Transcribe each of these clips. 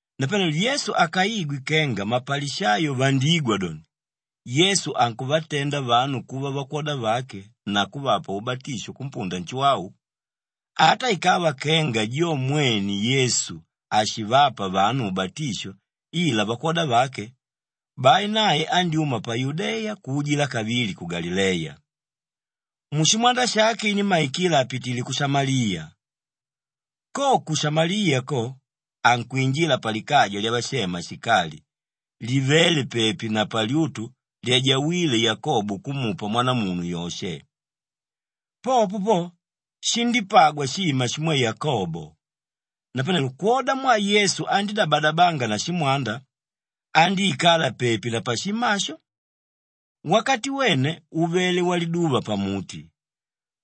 Napanelo Yesu akaigwe kenga mapalishayo vandígwa doni, Yesu ankuvatenda vanu kuva vakwoda vake na kuvapa ubatisho kumpunda Nshuwau, ata ikava kenga jo mwene Yesu hashivapa vanu ubatisho ila vakwoda vake, bai nae andyúma pa Yudeya kuujila kavili ku Galileya. Mushimwanda shake inímmaikila apitile ku Shamaliya. Ko ku Shamaliya ko ankwinjila palikaja lyavashema Shikali livéle pepi na palyutu lyajawíle Yakobo kumupa mwanamunu Yoshe. Popo po shindípagwa shima shimwe Yakobo. Napanelo kwodamwaa Yesu andídabadabanga na shimwanda, andíikala pepi na pashima asho. Wakati wene uvele waliduva pamuti.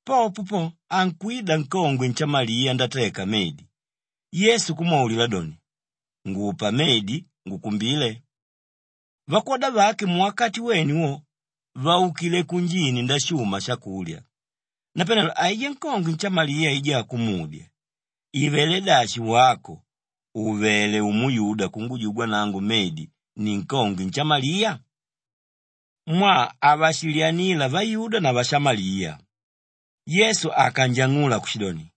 Popo po ankwida nkongwe nshamaliya ndateka medi, Yesu kumwaulila doni, “Ngupa medi ngukumbile,” vakwoda vake muwakati wene wo vaukile kunjini ndashuma shakulya. Napanelo aijá nkongwe nshamaliya aijá kumudya, “Ivelé dashi wako ùvele umuyuda kungujugwa nangu medi ninkongwe nshamaliya?” Mwaa havashilyanila vayuda na vashamaliya. Yesu akanjang'ula kushidoni,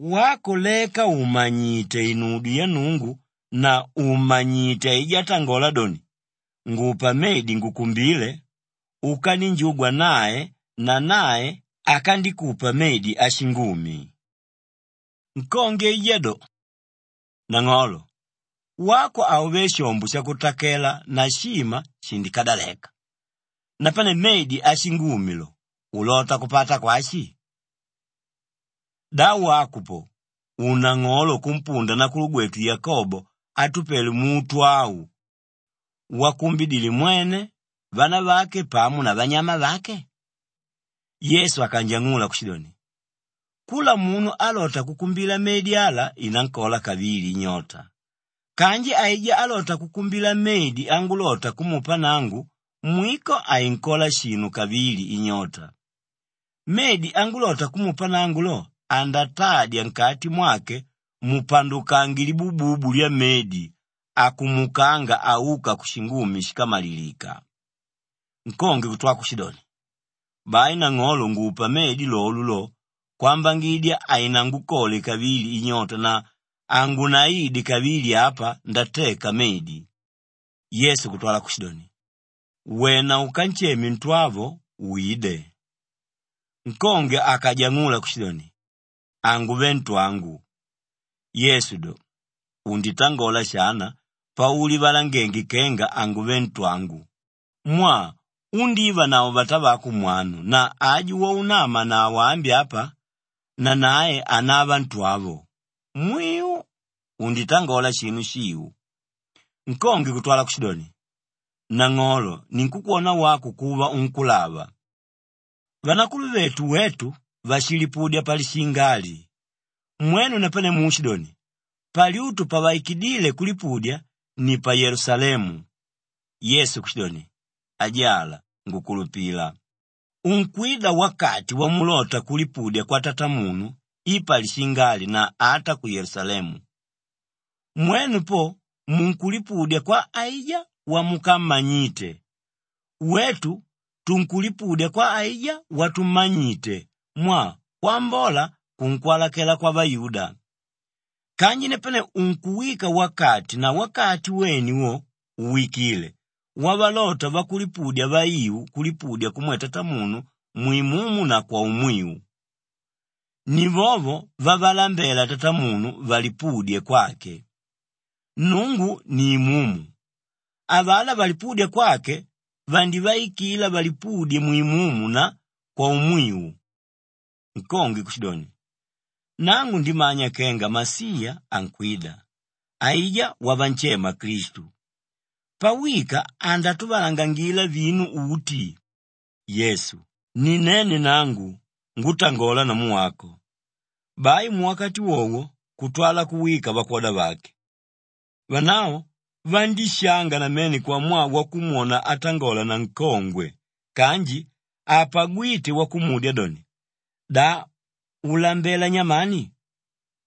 “Wako leka ùmanyite inudyo ya Nnungu na ùmmanyite aijá átangola doni, ‘Ngupa medi ngukumbile,’ ukaninjugwa nae na nae akandikupa medi ashingumi.” Nkongwe aijá do, “Nang'olo, wako hauvé shombo shakutakela na shima shindikadaleka, napane medi ashingumi lo, ulota kupata kwashi? Da wako po ùnang'olo kumpunda nakulugwetu Yakobo átupele muto au wakumbidile mwene, vanavake pamo na vanyama vake?” Yesu akanjang'ula kushidoni, “Kula munu álota kukumbila medi ala inankola kavili inyota kanji aijá álota kukumbila medi angulota kumupa nangu mwiko hainkola shinu kavili inyota. Medi angulota kumupa nangu lo andatadya nkati mwake mupandukange libububu lyamedi akumukanga auka kushingumi shíkamalilika.” Nkongwe kutwa kushidoni, “Bai nang'olo ngupa medi lolo lo kwambangidya hainangukole kavili inyota na hangunaide kavili apa ndateka medi.” Yesu kutwala kushidoni, “Wena ukansheme ntwavo, wide.” Nkongwe akajang'ula kushidoni, “Hanguve ntwangu.” Yesu do, “Unditangola shana paulivalangenge kenga ‘Hanguve ntwangu,’ mwaa undívanavo vatavako mwanu na aju waunamanavo ambi apa, nanae hanava ntwavo. Mwiu, unditangola shinu shiu.” Nkongwe kutwala kushidoni, “Nang'olo ninkukwona wako kuva unkúlava. Vanakuluvetu wetu vashilipudya palishinga ali. Mwenu napane muushidoni, palyutu pavaikidíle kulipudidya ni pa Yelusalemu.” Yesu kushidoni, “Ajala ngukulupila, unkwida wakati wamulota kulipudya kwa Tatamunu i palishinga ali na ata ku Yelusalemu. Mwenu po munkulipudya kwa aijá wamukammanyite; wetu tunkulipudya kwa aijá watummanyite mwaa kwambola kunkwalakela kwavayuda. Kanji napane unkuwika wakati na wakati wene wo uwikile wavalota vakulipudya vaiu kulipudya kumwe Tatamunu mwimumu na kwaumwiu. Ni vovo vavalambela Tatamunu valipudye kwake. Nnungu ni imumu; avalá valipúdya kwake vandivaikila valipudye mwimumu na kwaumwiu.” Nkongwe kushidoni, “Nangu ndimanya kenga Masiya ankwida, aijá wavanshema Klistu. Pawika andatuvalangangila vinu uti.” Yesu, “Ni nene nangu, ngútangola namu wako.” Bai muwakati wowo kutwala kuwika vakwoda vake. Vanavo vandíshanga namene kwamwaa wakumwona atangola na nkongwe kanji hapagwíte wakumudya doni, “Da ulambela nyamani?”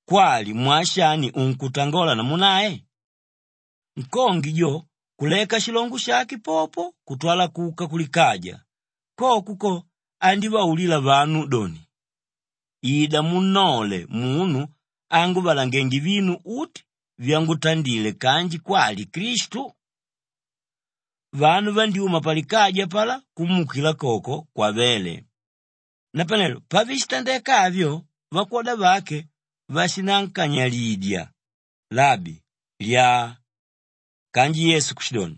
kwali, “Mwaa shani unkutangola namu nae?” Nkongwe jo kuleka shilongo shake popo kutwala kuka kulikaja, koko ko andívaulila vanu doni, “Ida munnole munu ánguvalangenge vinu uti vyangutandile kanji kwali Klistu?” Vanu vandyúma palikaja apalá kumuukila koko kwavéle. Napanelo pavishitandeka avyo vakwoda vake vashinankanyilidya, “Labi, lyaa!” Kanji Yesu kushidoni,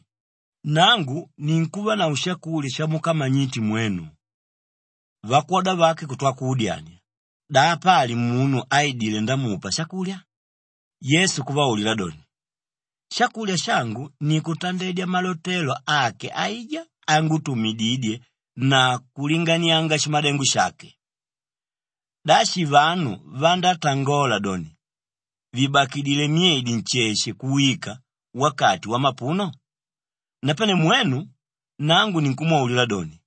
“Nangu ninkuvanavo shakulya shamukamanyite mwenu.” Vakwoda vake kutwa kuudyania, “Da apali munu áidile ndamupa shakulya?” Yesu kuvaulila doni, “Shakulya shangu ni kutandedya malotelo ake aijá ángutumididye na kulinganianga shimadengo shake. Da shi vanu vandátangola doni, ‘Vibakidile myedi nsheshe kuwika wakati wamapuno’? Napane mwenu, nangu ninkumwaulila doni,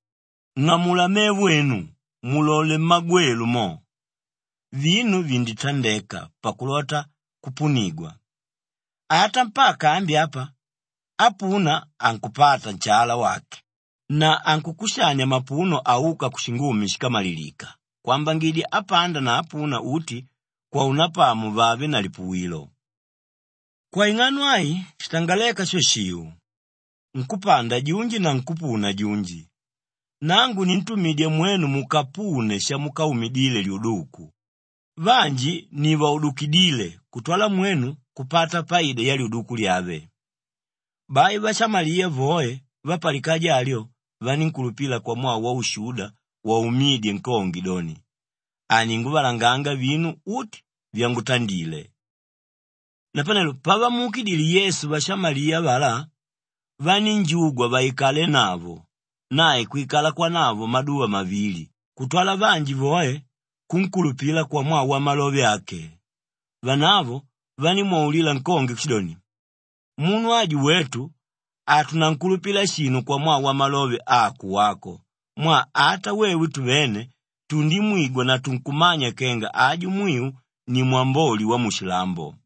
ng'amula mevo enu, mulole mmagwelu mo! Vinu vinditandeka pakulota kupunigwa. Ata mpaka ambi apa ápuna ankupata nshala wake na ankukushania mapuno áuka kushingumi shíkamalilika kwambangidya ápanda na ápuna uti kwaunapamo vave na lipuwilo. Kwaing'ano ai shitangaléka sho shiu, ‘Nkúpanda junji na nkúpuna junji.’ Nangu nintumidya mwenu mukapune shamukaumidile lyuduku; vanji ni vaudukidíle kutwala mwenu kupata paida yalyuduku lyave.” Bai vashamaliya voe vapalikaja alyo vanínkulupila kwamwaa waushuda waumídye nkongwe doni, “Aninguvalanganga vinu uti vyangutandile.” Napanelo pavamuukidile Yesu vashamaliya avalá, vanínjugwa vaikalenavo, nae kwikala kwanavo maduva mavili kutwala vanji voe kunkulupila kwamwaa wamalove ake. Vanavo vanímwaulila nkongwe kushidoni, “Munu aju wetu hatunankulupila shinu kwamwaa wamalove ako wako mwaa ata wewe tuvene tundimwigwa na tunkumanya kenga aju mwiu ni Mwamboli wamushilambo.”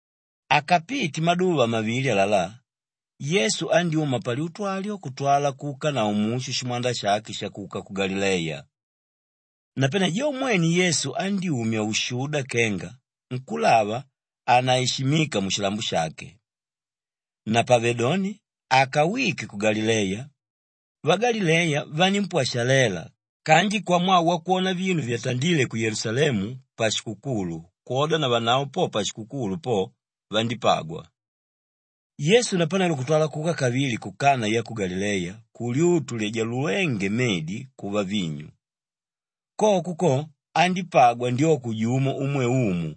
Akapite maduva mavili alalá, Yesu andyúma palyutu alyo kutwala kuukanavo mushu shimwanda shake shakuka ku Galileya. Napane jo mwene Yesu andyúmya ushuda kenga nkúlava hanaishimika mushilambo shake. Napavedoni akawike ku Galileya, vagalileya vanímpwashalela kanji kwamwaa wakwona vinu vyatandíle ku Yelusalemu pashikukulu kwoda navanavo po pashikukulu po vandípagwa. Yesu napanelo kutwala kuka kavili ku Kanaa ya ku Galileya kulyutu lyajalulénge medi kuva vinyu. Koko ko andípagwa ndyoko jumo umwe umu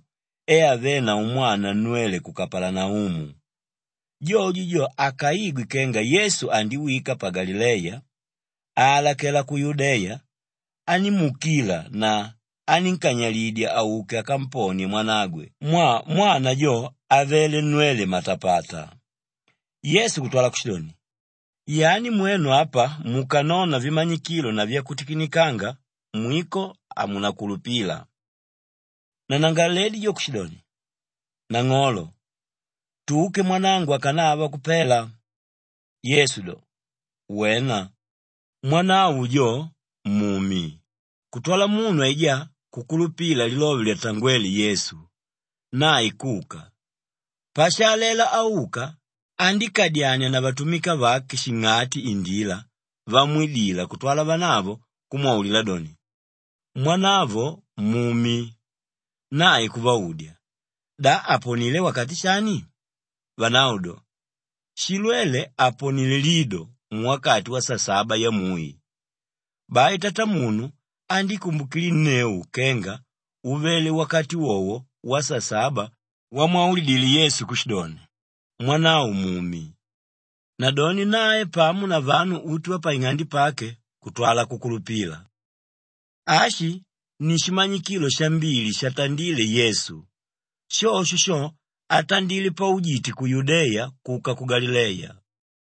e avénavo mwana nnwele ku Kapalanaumu. Jojo jo akaigwe kenga Yesu andiwika pa Galileya aalakela ku Yudeya, anímuukila na anínkanyilidya auke akamponie mwanagwe mwaa mwana jo avele nnwele matapata. Yesu kutwala kushidoni, “Yani mwenu apa mukanona vimanyikilo na vyakutikinikanga mwiko hamunakulupila.” Nanangalaledi jo kushidoni, “Nang'olo, tuke mwanangu akanava kupela.” Yesu do, “Wena! Mwanavo jo mumi,” kutwala munu aijá kukulupila lilove lyatangwéle Yesu, nae kuka. Pashaalela auka, andíkadyania na vatumika vake shing'ati indila vamwidila kutwala vanavo kumwaulila doni, “Mwanavo mumi.” Nae kuvaudya, “Da aponilé wakati shani?” Vanavo do, “Shilwele aponilé lido muwakati wasasaba yamui.” Bai tatamunu andíkumbukilinneu kenga uvele wakati wowo wasasaba wamwaulidile Yesu kushidoni, “Mwanavo mumi.” Nadoni nae pamo na vanu uti vapaing'ande pake kutwala kukulupila. Ashi ni shimanyikilo shambili shatandíle Yesu, shosho sho atandile paujite ku Yudeya kuka ku Galileya.